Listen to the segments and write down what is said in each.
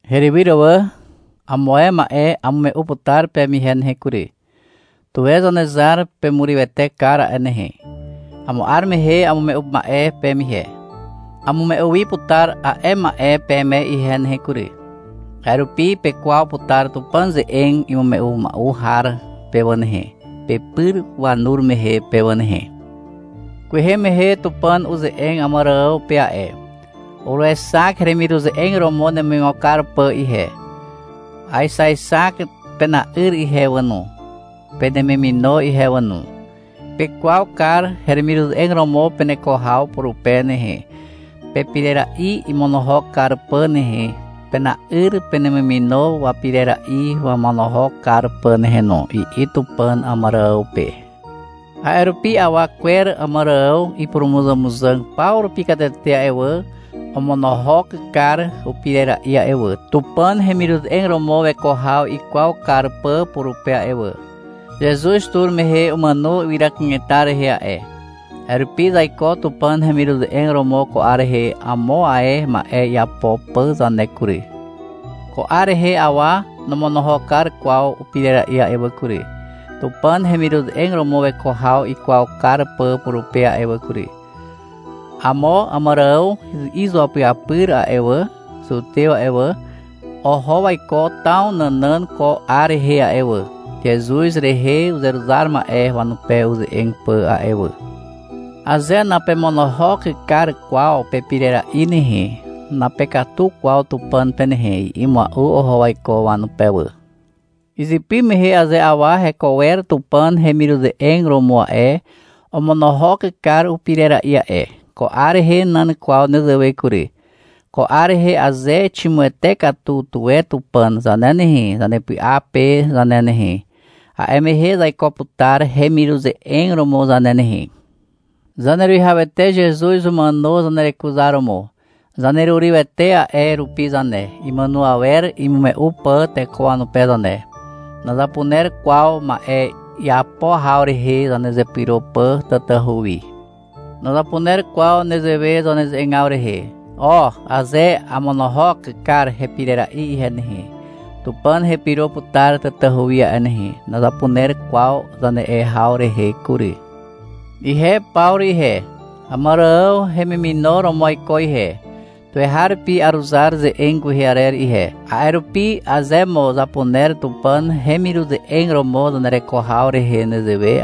Herywyr wà. Amo ae ma'e amume'u putar peme ihe nehe kury. Tuwe Zanezar pemurywete kar a'e nehe. Amo 'ar mehe amume'u ma'e peme ihe. Amume'u wi putar a'e ma'e peme ihe nehe kury. A'e rupi pekwaw putar Tupàn ze'eg imume'u mua'u har pe wà nehe, pepyr wanur mehe pe wà nehe. (Kwehe mehe Tupàn uze'eg Àmàrààw pe a'e. — Uruexak heremiruze'eg romo nemuigo kar pà ihe. Aexaexak pena'yr ihe wà no, penemimino ihe wà no. Pekwaw kar heremiruze'eg romo peneko haw purupe nehe, pepirera'i imonohok kar pà nehe, pena'yr penemimino wapirera'i wamonohok kar pà nehe no, i'i Tupàn Àmàrààw pe. A'e rupi awa kwer Àmàrààw ipurumuzàmuzàg paw rupi katete a'e wà, omonohok kar upirera'i a'e wà, Tupàn hemiruze'eg romo weko haw ikwaw kar pà purupe a'e wà. Zezuz tur mehe umàno ywyra kanetar rehe a'e. A'e rupi zaiko Tupàn hemiruze'eg romo ko 'ar rehe amo ae ma'e iapo pà zane kury. Ko 'ar rehe awa nomonohok kar kwaw upirera'i a'e wà kury, Tupàn hemiruze'eg romo weko haw ikwaw kar pà purupe a'e wà kury.) Amo Àmàrààw izuapyapyr a'e wà, zutew a'e wà, oho waiko taw nànàn ko 'ar rehe a'e wà, Zezuz rehe uzeruzar ma'e wanupe uze'eg pà a'e wà. — Aze napemonohok kar kwaw pepirera'i nehe, napekatu kwaw Tupàn pe nehe, i'i mua'u oho waiko wanupe wà. Izypy mehe aze awa heko wer Tupàn hemiruze'eg romo a'e, omonohok kar upirera'i a'e. Ko 'ar rehe nan kwaw nezewe kury. Ko 'ar rehe aze ximuwete katu tuwe Tupàn zane nehe, zanepy'a pe zane nehe, a'e mehe zaiko putar hemiruze'eg romo zane nehe. Zaneruwihawete Zezuz umàno zanerekuzaromo. Zanerurywete a'e rupi zane, imàno awer imume'u pà teko wanupe zane. Nazapuner kwaw ma'e iapo haw rehe zanezepyro pà tatahu wi. Nazapuner kwaw nezewe zaneze'egaw rehe. — O, aze amonohok kar hepirera'i ihe nehe, Tupàn hepyro putar tatahu wi a'e nehe, nazapuner kwaw zane'e haw rehe kury. Ihe Pawru ihe, Àmàrààw hemimino romo aiko ihe. Tuweharupi aruzar ze'eg kwehe arer ihe. A'e rupi aze mo zapuner Tupàn hemiruze'eg romo zanereko haw rehe nezewe,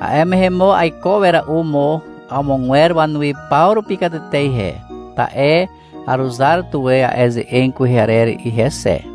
a'e mehe mo aiko wera'u mo amogwer wanuwi paw rupi katete ihe. Ta'e aruzar tuwe a'e ze'eg kwehe arer ihe xe.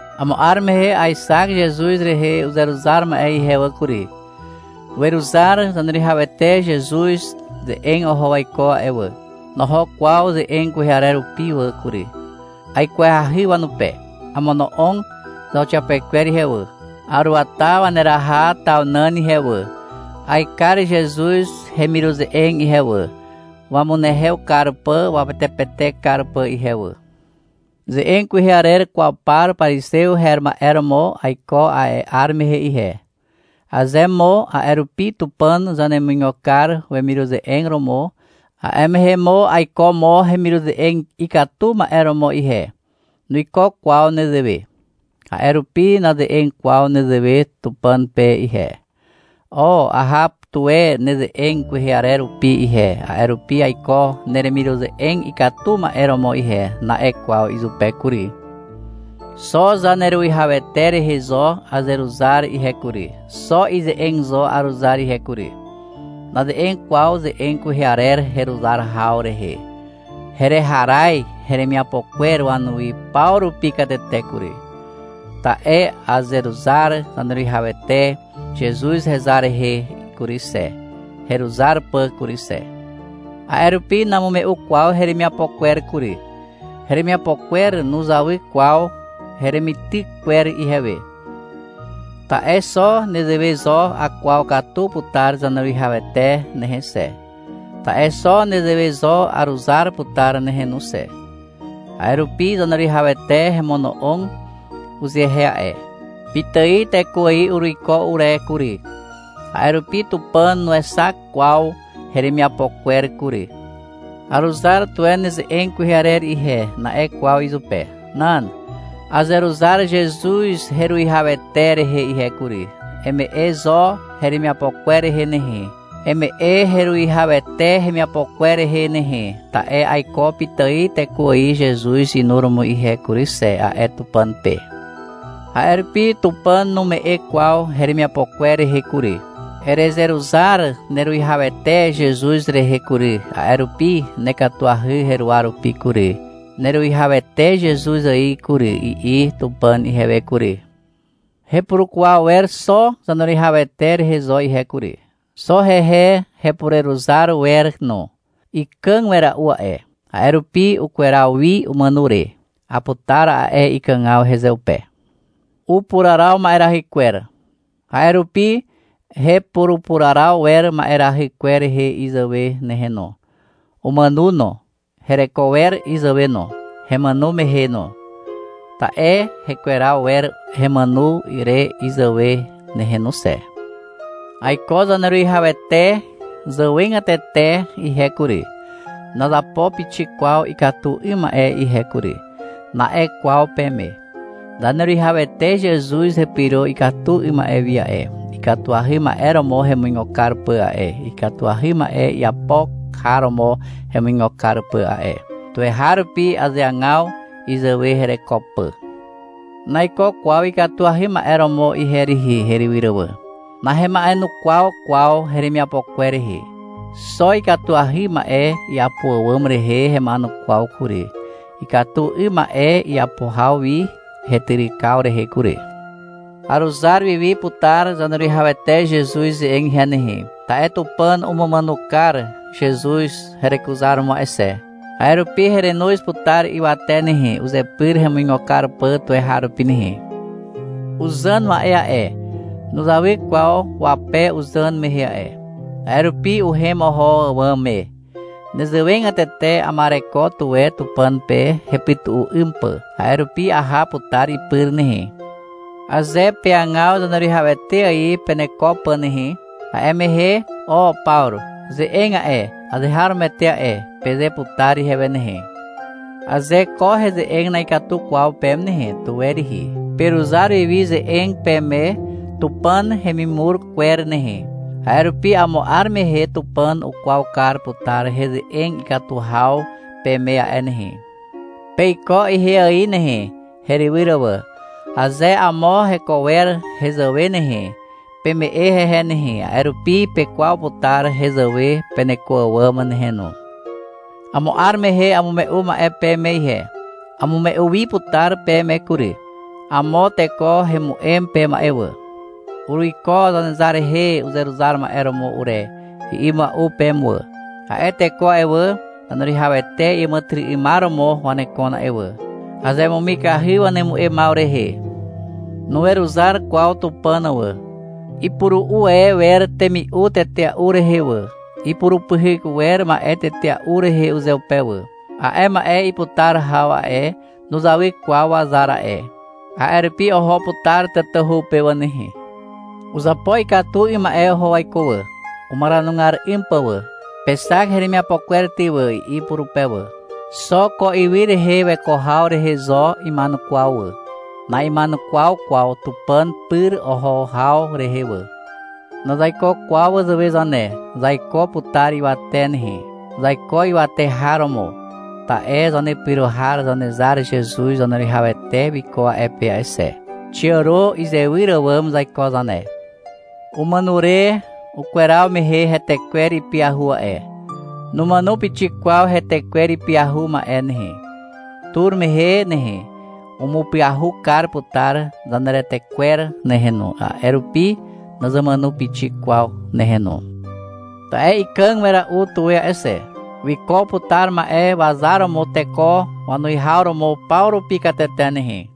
Amo 'ar mehe aexak Zezuz rehe uzeruzar ma'e ihe wà kury. Weruzar Zaneruwihawete Zezuz ze'eg oho waiko a'e wà. Noho kwaw ze'eg kwehe arer rupi wà kury. Aikwahy wanupe. Amono'og zauxiapekwer ihe wà. Aruata waneraha taw nàn ihe wà. Aekar Zezuz hemiruze'eg ihe wà, wamunehew kar pà wapetepetek kar pà ihe wà. Ze'eg kwehe arer kwaw par parizew her ma'e romo aiko a'e 'ar mehe ihe. Aze mo a'e rupi Tupàn zanemuigo kar wemiruze'eg romo, a'e mehe mo aiko mo hemiruze'eg ikatu ma'e romo ihe. Nuiko kwaw nezewe. A'e rupi naze'eg kwaw nezewe Tupàn pe ihe. — O, aha tuwe neze'eg kwehe arer rupi ihe, a'e rupi aiko neremiruze'eg ikatu ma'e romo ihe, na'e kwaw izupe kury. Xo Zaneruwihawete rehe zo azeruzar ihe kury, xo ize'eg zo aruzar ihe kury. Naze'eg kwaw ze'eg kwehe arer heruzar haw rehe. Hereharaz heremiapo kwer wanuwi paw rupi katete kury. Ta'e azeruzar Zaneruwihawete Zezuz hezar rehe kury xe, heruzar pà kury xe. A'e rupi namume'u kwaw heremiapo kwer kury. Heremiapo kwer nuzawy kwaw heremityk kwer ihewe. Ta'e xo nezewe zo akwaw katu putar Zaneruwihawete nehe xe. Ta'e xo nezewe zo aruzar putar nehe no xe. A'e rupi Zaneruwihawete hemono'og uzehe a'e. Pitài teko ài uruiko ure kury. A'e rupi Tupàn nuexak kwaw heremiapo kwer kury. — Aruzar tuwe neze'eg kwehe arer ihe, na'e kwaw izupe. Nan. — Azeruzar Zezuz heruwihawete rehe ihe kury, eme'e zo heremiapo kwer rehe nehe, eme'e heruwihawete hemiapo kwer rehe nehe, ta'e aiko pitài teko ài Zezuz inuromo ihe kury xe, a'e Tupàn pe. A'e rupi Tupàn nume'e kwaw heremiapo kwer rehe kury. — Erezeruzar neruwihawete Zezuz rehe kury, a'e rupi nekatuahy heruwa rupi kury, neruwihawete Zezuz ài kury, i'i Tupàn ihewe kury. Hepurukwaw wer xo Zaneruwihawete rehe zo ihe kury. Xo hehe hepureruzar wer no. Ikàg wera'u a'e. A'e rupi ukweraw wi umàno re. Aputar a'e ikàgaw hezeupe. Upuraraw ma'erahy kwer. A'e rupi hepurupuraraw wer ma'erahy kwer rehe izàwe nehe no. Umàno no. Hereko wer izàwe no, hemàno mehe no. Ta'e hekweraw wer hemàno re izàwe nehe no xe. — Aiko Zaneruwihawete zàwegatete ihe kury, nazapo pixik kwaw ikatu 'ym ma'e ihe kury, na'e kwaw peme. Zaneruwihawete Zezuz hepyro ikatu 'ym ma'e wi a'e, ikatuahy ma'e romo hemuigo kar pà a'e, ikatuahy ma'e iapo har romo hemuigo kar pà a'e. Tuweharupi azeagaw izàwe hereko pà. Naiko kwaw ikatuahy ma'e romo ihe rihi, herywyr wà. Nahema'enukwaw kwaw heremiapo kwer rehe. Xo ikatuahy ma'e iapo àwàm rehe hema'enukwaw kury, ikatu 'ym ma'e iapo haw wi hetyrykaw rehe kury. Aruzar wiwi putar Zaneruwihawete Zezuz ze'eg ihe nehe, ta'e Tupàn umumàno kar Zezuz herekuzaromo a'e xe. A'e rupi herenoz putar ywate nehe, uzepyr hemuigo kar pà tuweharupi nehe. Uzàn ma'e a'e, nuzawy kwaw wape uzàn mehe a'e. A'e rupi uhem oho àwàm me. Nezewegatete ama'ereko tuwe Tupàn pe hepytu'u 'ym pà. A'e rupi aha putar ipyr nehe. Aze peagaw Zaneruwihawete ài peneko pà nehe, a'e mehe, — O, Pawru ze'eg a'e, azeharomoete a'e, peze putar ihewe nehe. Aze ko heze'eg na'ikatu kwaw peme nehe, tuwe rihi, peruzar wiwi ze'eg peme Tupàn hemimur kwer nehe. A'e rupi amo 'ar mehe, Tupàn ukwaw kar putar heze'eg ikatu haw peme a'e nehe. Peiko ihe ài nehe, herywyr wà. Aze amo heko wer hezàwe nehe, peme'e hehe nehe, a'e rupi pekwaw putar hezàwe peneko àwàm nehe no. Amo 'ar mehe amume'u ma'e peme ihe. Amume'u wi putar peme kury. Amo teko hemu'em peme a'e wà. — Uruiko Zanezar rehe uzeruzar ma'e romo ure, i'i mua'u peme wà. A'e teko a'e wà, Zaneruwihawete iàmàtyry'ymar romo wanekon a'e wà. Azemumikahy wanemu'emaw rehe. Nuweruzar kwaw Tupàn wà. Ipuru'u e wer temi'u tetea'u rehe wà, ipurupyhyk wer ma'e tetea'u rehe uzeupe wà. A'e ma'e iputar haw a'e, nuzawy kwaw wazar a'e. A'e rupi oho putar tatahu pe wà nehe. Uzapo ikatu 'ym ma'e oho waiko wà, umaranugar 'ym pà wà. — Pexak heremiapo kwer ty wà, i'i purupe wà. Xo ko ywy rehe weko haw rehe zo ima'enukwaw wà. Na'ima'enukwaw kwaw Tupàn pyr oho haw rehe wà. Nazaiko kwaw wazàwe zane. Zaiko putar ywate nehe. Zaiko ywate har romo. Ta'e zanepyro har Zanezar Zezuz Zaneruwihawete wiko a'e pe a'e xe. Xiàro izewyr àwàm zaiko zane. Umàno re ukweraw mehe hetekwer ipyahu a'e. Numàno pixik kwaw hetekwer ipyahu ma'e nehe. Tur mehe nehe, umupyahu kar putar zaneretekwer nehe no, a'e rupi nazamàno pixik kwaw nehe no. Ta'e ikàg wera'u tuwe a'e xe. Wiko putar ma'e wazar romo teko wanuwihaw romo paw rupi katete nehe.